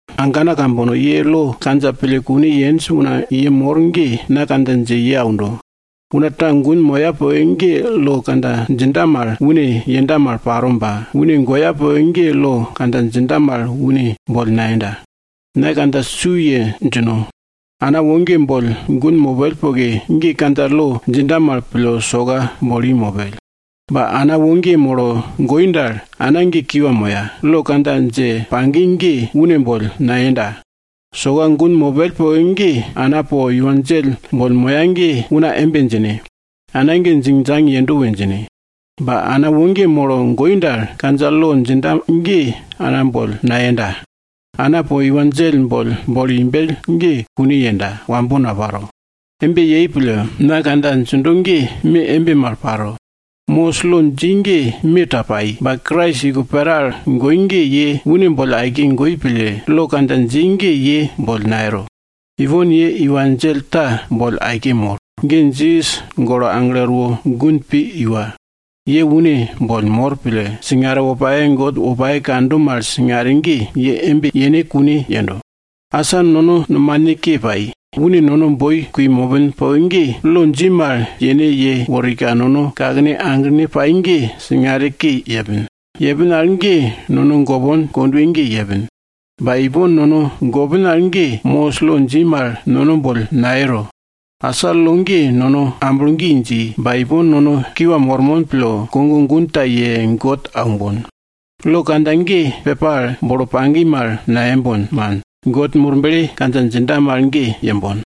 Agana ambana kambono, ye lo kandja pille kune yenj una ye mor ge, na kandja dje ye aundo. Una ta gun moya poke ge lo kandja djinda mal, une yenda mal paro ba, une goya poke ge lo kandja djinda mal une boll nayenda. Na kandja su ye djino. Ana woge boll gun mopell poke ge, kandja lo djinda mal pille soka bolo i mopell. Ba, ana woge molo goi dal, ana ge kiwa moya, lo kandja dje pagi ge, une boll nayenda. Soka gun mopell poke ge ana po iwa djell boll moya ge una embe djine, ana ge djingdjang yendo we djine. Ba ana woge molo goi dal, kandja lo djinda ge ana boll nayenda. Ana po iwa djell boll bolo imbell ge, kune yenda, wambo napanda. Embe paro pille, na kandja djindo ge me embe mal paro. Mosis lo dji ge me ta pai, ba Krais iko pera al goi ge ye une boll aike goi pille, lo kandja dji ge ye boll nayero. Ipon ye iwa djell ta boll aike mor, ge Jisas golo aglo erwo gun pi iwa. Ye une boll mor pille, singare wopake God wopake kando mal singare ge, ye embe yene kune yendo. Asa nono nomane ke pai ge, nono boi kui mopin. Mopin poke ge, lo dji mal yene yeworika nono kakene aglene pai ge singare ke yepin. Yepin al ge nono gopon kondwe ge yepin. Ba ipon nono gopin al ge, Mosis lo dji mal nono boll nayero. Asa lo ge nono amblo gi dji ba ipon nono kiwa mormon pille, kogo gun ta ye God aumbon. Lo kandja ge pepa al bolo pagi mal nayembon, man, God Murble kandja djinda mal ge yembon.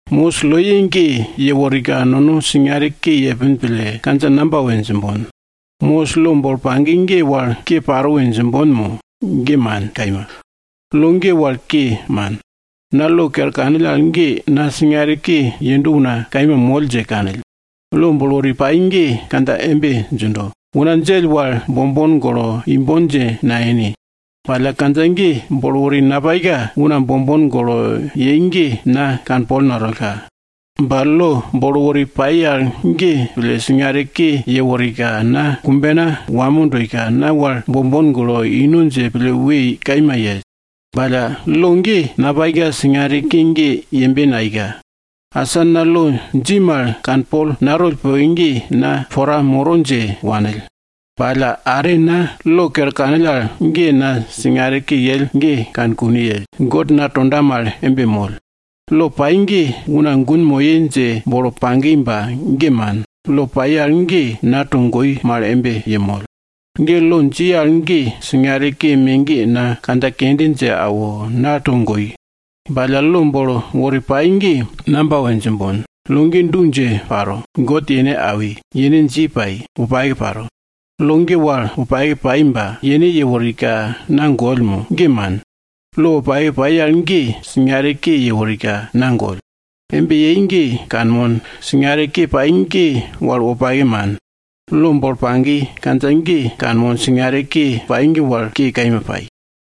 Mosis loye ge yeworika nono singare ke yepin pille, kandja namba we djimbon? Mosis lo bolo pagi ge wal ke paro we djimbon mo? Ge man kaima! Lo ge wal ke, man. Na lo kere kanill al ge na singare ke yendo una kaima moll dje kanill. Lo bolo wori pai ge kandja embe djindo, una djell wal bombon golo imbon dje nayene. Ba alla kandja ge bolo wori napaika, una bombon golo yenj ge na kanpol natollka. Ba lo bolo wori pai al ge pille, singare ke yeworika, na kumbena wamo doika, na wal bombon golo ino dje pille we kaima yell. Ba alla lo ge napaika, singare ke ge yembe nayeika. Asa na lo dji mal kanpol natoll poke ge, na pora moro dje wanill. Ba alla are na lo kere kanill al ge, na singare ke yell ge kane kune yell. God na tonda mal embe moll. Lo pai ge una gun moye dje bolo pagi ba ge man. Lo pai al ge na togoi mal embe yemoll. Lo dji al ge, singare ke me ge na kandja kende dje awo, na togoi. Ba lo bolo wori pai ge namba we djimbon? Lo ge du dje paro. God yene awi, yene dji pai, wopake paro. Lo ge wal wopake pai ba yene yeworika, na goll mo? Ge man! Lo wopake pai al ge, singare ke yeworika, na goll. Embe yei ge kanmon, singare ke pai ge wal wopake man. Lo bolo pagi kandja ge kanmon, singare ke pai ge wal ke kaima pai.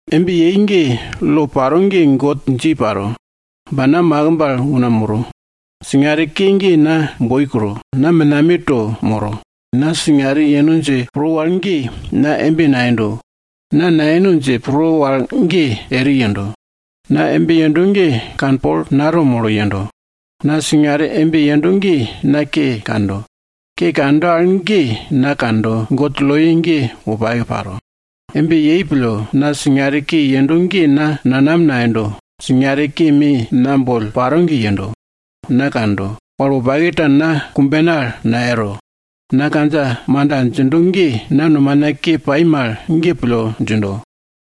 Embe yei ge lo paro ge God dji paro. Ba na makimb al una moro. Singare ke ge na boi kro, na menameto moro. Na singare yeno dje pro wal ge, na embe nayendo. Na nayeno dje pro wal ge, eri yendo. Na embe yendo ge kanpol nato molo yendo. Na singare embe yendo ge na ke kando, ke kando al ge na kando, God loye ge wopake paro. Embe yei pille, na singare ke yendo ge na nanam nayendo. Singare ke me na boll paro ge yendo. Na kando, wal wopake ta na kumbena al nayero. Na kandja manda djindo ge, na nomana ke pai mal ge pille djindo.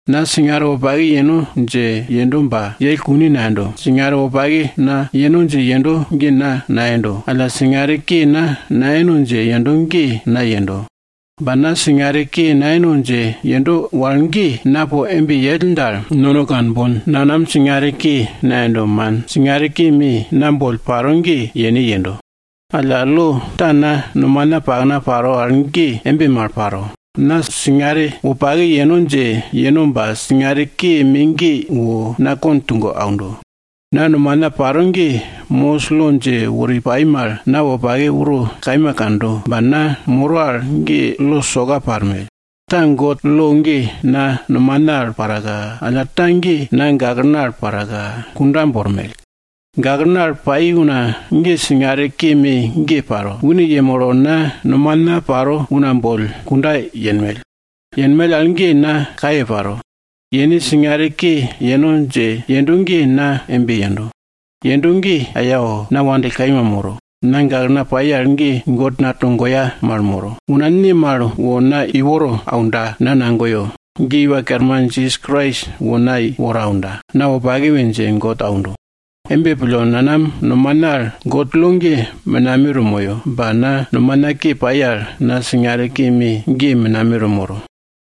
Na singare wopake yeno dje yendo ba yell kune nayendo. Singare wopake na yeno dje yendo ge na nayendo, alla singare ke na nayeno dje yendo ge na yendo. Ba na singare ke nayeno dje yendo wal ge na po embe yell dal, nono kanbon, nanam singare ke nayendo, man. Singare ke me na boll paro ge, yene yendo. Alla lo ta na nomana pakna paro al ge embe mal paro. Na singare wopake yeno dje yeno ba singare ke me ge wo na kond tugo aundo. Na nomana paro ge, Mosis lo dje wori pai mal, na wopake uro kaima kando ba na moro al ge lo soka parmell. Ta God lo ge na nomana al paraka, alla ta ge na gaklena al paraka, kunda bormell. Gaklena al pai una ge singare ke me ge paro. Une yemolo na nomana paro una boll kunda yenmell. Yenmell al ge na kaye paro, yene singare ke yeno dje yendo ge na embe yendo. Yendo ge ayao! Na wandill kaima moro. Na gaklena pai al ge God na togoya mal moro, una ne mal wo na iworo aunda na nagoyo? Ge Iwa Kerman Jisas Krais wo na iworo aunda! Na wopake we dje God aundo! Embe pille, nanam nomana al God lo ge menameto moyo, ba na nomana ke pai al, na singare ke me ge menameto moro.